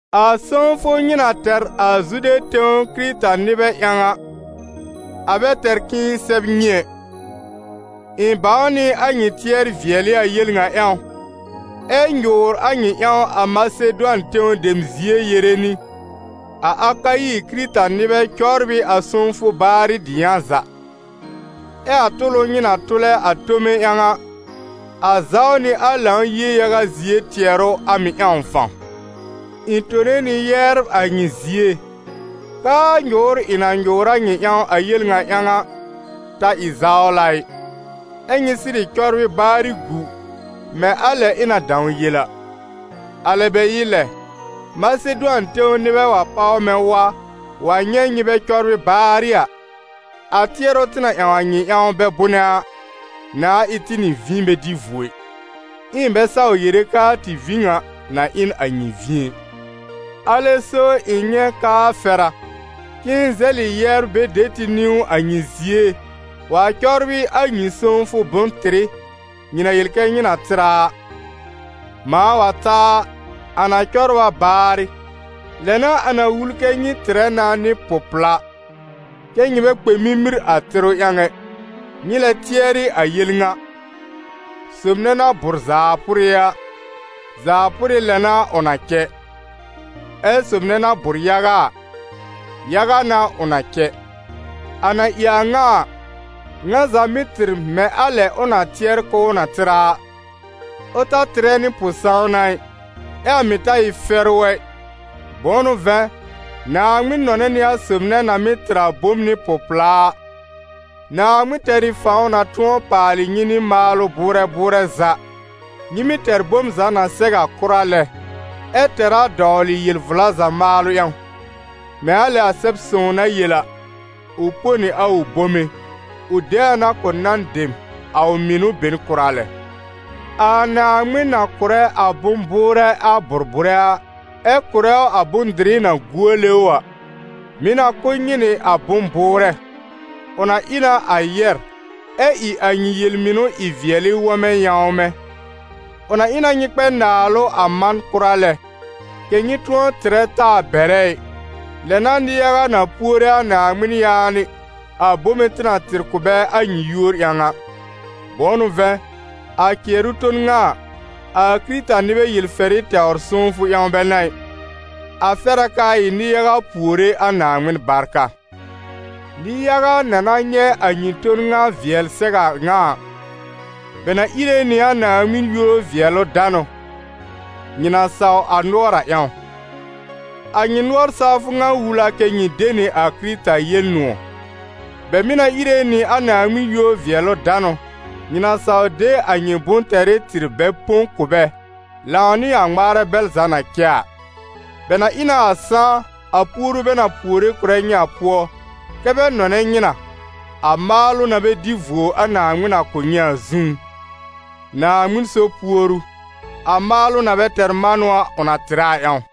A sõwfʋ nyɩ na tɛr a Zude tẽw Kɩrɩta-nɩbɛ ƴãw a, a bɛ tɛr k'ɩ̃ɩ sɛb nyɩ ɛ. Ɩ̃ bãw nɩ a nyɩ tɩɛr-vɩɛlɩ a yel ŋa ƴãw, ɛ́ nyʋʋr a nyɩ ƴãw a Masedʋan tẽw dem zie yere nɩ: «A Akayi Kɩrɩta-nɩbɛ cɔbr ɩ a sõwfʋ baarɩ dɩyã za.» Ɛ a tʋlʋ nyɩ na tʋlɛ a tome ƴãw a, a zaw nɩ a Lãw-yie yaga zie tɩɛrʋ a mɩ̀ ƴãw fãw. Ɩ̃ tone nɩ yɛbr a nyɩ zie, k'aa nyʋʋr ɩ̃ na nyʋʋr a nyɩ ƴãw a yel ŋa ƴãw a, ta ɩ zawla ɩ, ɛ́ nyɩ sɩrɩ cɔbrɩ baarɩ gu, mɛ̃ a lɛ ɩ̃ na dãw yel a. Alɛ bɛ ɩ lɛ, Masedʋan tẽw nɩbɛ wa páw mɛ̃ wa, wa nyɛ̃ nyɩ bɛ cɔbrɩ baarɩ a, a tɩɛrʋ tɩ na ƴãw a nyɩ ƴãw bɛ bʋnɛ a, nãa ɩ tɩ nɩ vĩ bɛ dɩ vuo ɩ, ɛ ɩ̃ bɛ saw yere k'aa tɩ vĩ ŋa na ɩ n a nyɩ vĩ ɛ. Alɛ so ɩ̃ nyɛ̃ k'aa fɛr a, k'ɩ̃ɩ zɛlɩ yɛbr bɛ de tɩ niwn a nyɩ zie wa cɔbrɩ a nyɩ sõwfʋ bʋ̃-tɩrɩ, nyɩ na yel kɛ nyɩ na tɩr a a. Mãa wa ta a, a na cɔbr a baarɩ, lɛ n'a a na wul kɛ́ nyɩ tɩrɛ na nɩ pʋ-pla, kɛ nyɩ bɛ kpɛ mimir a tɩrʋ ƴãw ɛ. Nyɩ lɛ tɩɛrɩ a yel ŋa: Sob nɛ na bʋ̀r zaa pʋrɩ a, zaa pʋrɩ lɛ n'a ʋ na cɛ; ɛ sob nɛ na bʋ̀r yaga a, yaga n'a ʋ na cɛ. A na ɩ a ŋa a, ŋa za mɩ́ tɩr mɛ̃ a lɛ ʋ na tɩɛr k'ʋʋ na tɩr a a, ʋ ta tɩrɛ nɩ pʋ-sãwna ɩ, ɛ́ a mɩ̀ ta ɩ fɛrʋ ɛ, bʋ̃ʋ n'ʋ vɛ̃, Naaŋmɩn nɔnɛ nɩ a sob nɛ na mɩ́ tɩr a bom nɩ pʋ-pla a. Naaŋmɩn tɛr ɩ fãw na tʋ̃ɔ paalɩ nyɩ nɩ maalʋ bʋʋrɛ bʋʋrɛ za, nyɩ mɩ́ tɛr bom za na sɛw a kʋra lɛ, ɛ tɛr a dɔwlɩ yel-vla za maalʋ ƴãw. Mɛ̃ a lɛ a Sɛb-sõw na yel a: «Ʋ põ nɩ a ʋ bome, ʋ de a na kʋ̀ nan dem a ʋ mɩnʋ be n kʋra lɛ.» A Naaŋmɩn na kʋ̀rɛ a bʋ̃-bʋʋrɛ a bʋ̀r-bʋ̀rɛ a, ɛ kʋ̀rɛ ʋ a bʋ̃-dɩrɩ na guole ʋ a, mɩ̀ na kʋ̀ nyɩ nɩ a bʋ̃-bʋʋrɛ, ʋ na ɩ na a yɛ̀r, ɛ ɩ a nyɩ yel-mɩnʋ ɩ-vɩɛlɩ wɔmɛ yãwmɛ̃. Ʋ na ɩ na nyɩ kpɛ naalʋ a man kʋra lɛ, kɛ̀ nyɩ tʋ̃ɔ tɩrɛ taa bɛrɛ ɩ, lɛ n'a nɩ-yaga na puore a Naaŋmɩn yaanɩ a bome tɩ na tɩr kʋ̀ bɛ a nyɩ yúor ƴãw a. Bʋ̃ʋ n'ʋ vɛ̃, a cɩɛrʋ ton ŋa a, a Kɩrɩta-nɩbɛ yel-fɛrɩ tɛwr sõwfʋ ƴãw bɛ n'a ɩ, a fɛr a k'aa ɩ nɩ-yaga puore a Naaŋmɩn barka. Nɩ-yaga na na nyɛ̃ a nyɩ ton ŋa vɩɛl sɛw a ŋa a, bɛ na íre nɩ a Naaŋmɩn yúor-vɩɛlʋ-danʋ, nyɩ na saw a nʋɔr a ƴãw. A nyɩ nʋɔr-sawfʋ ŋa wul a kɛ́ nyɩ de nɩ a Kɩrɩta Yel-nʋ̃ɔ̀. Bɛ mɩ̀ na íre nɩ a Naaŋmɩn yúor-vɩɛlʋ-danʋ, nyɩ na saw de a nyɩ bʋ̃-tɛrɩ tɩr bɛ põ kʋ̀ bɛ, lãw nɩ a ŋmaarɛ bɛl za na cɛ a. Bɛ na ɩ na a sãá, a puoru bɛ na puore kʋ̀rɛ nyɩ a pʋɔ, kɛ́ bɛ nɔnɛ nyɩ na, a maalʋ na bɛ dɩ vuo a Naaŋmɩn na kʋ̀ nyɩ a zũú. Naaŋmɩn so puoru, a maalʋ na bɛ tɛr manʋ ʋ na tɩrɛ a ƴãw.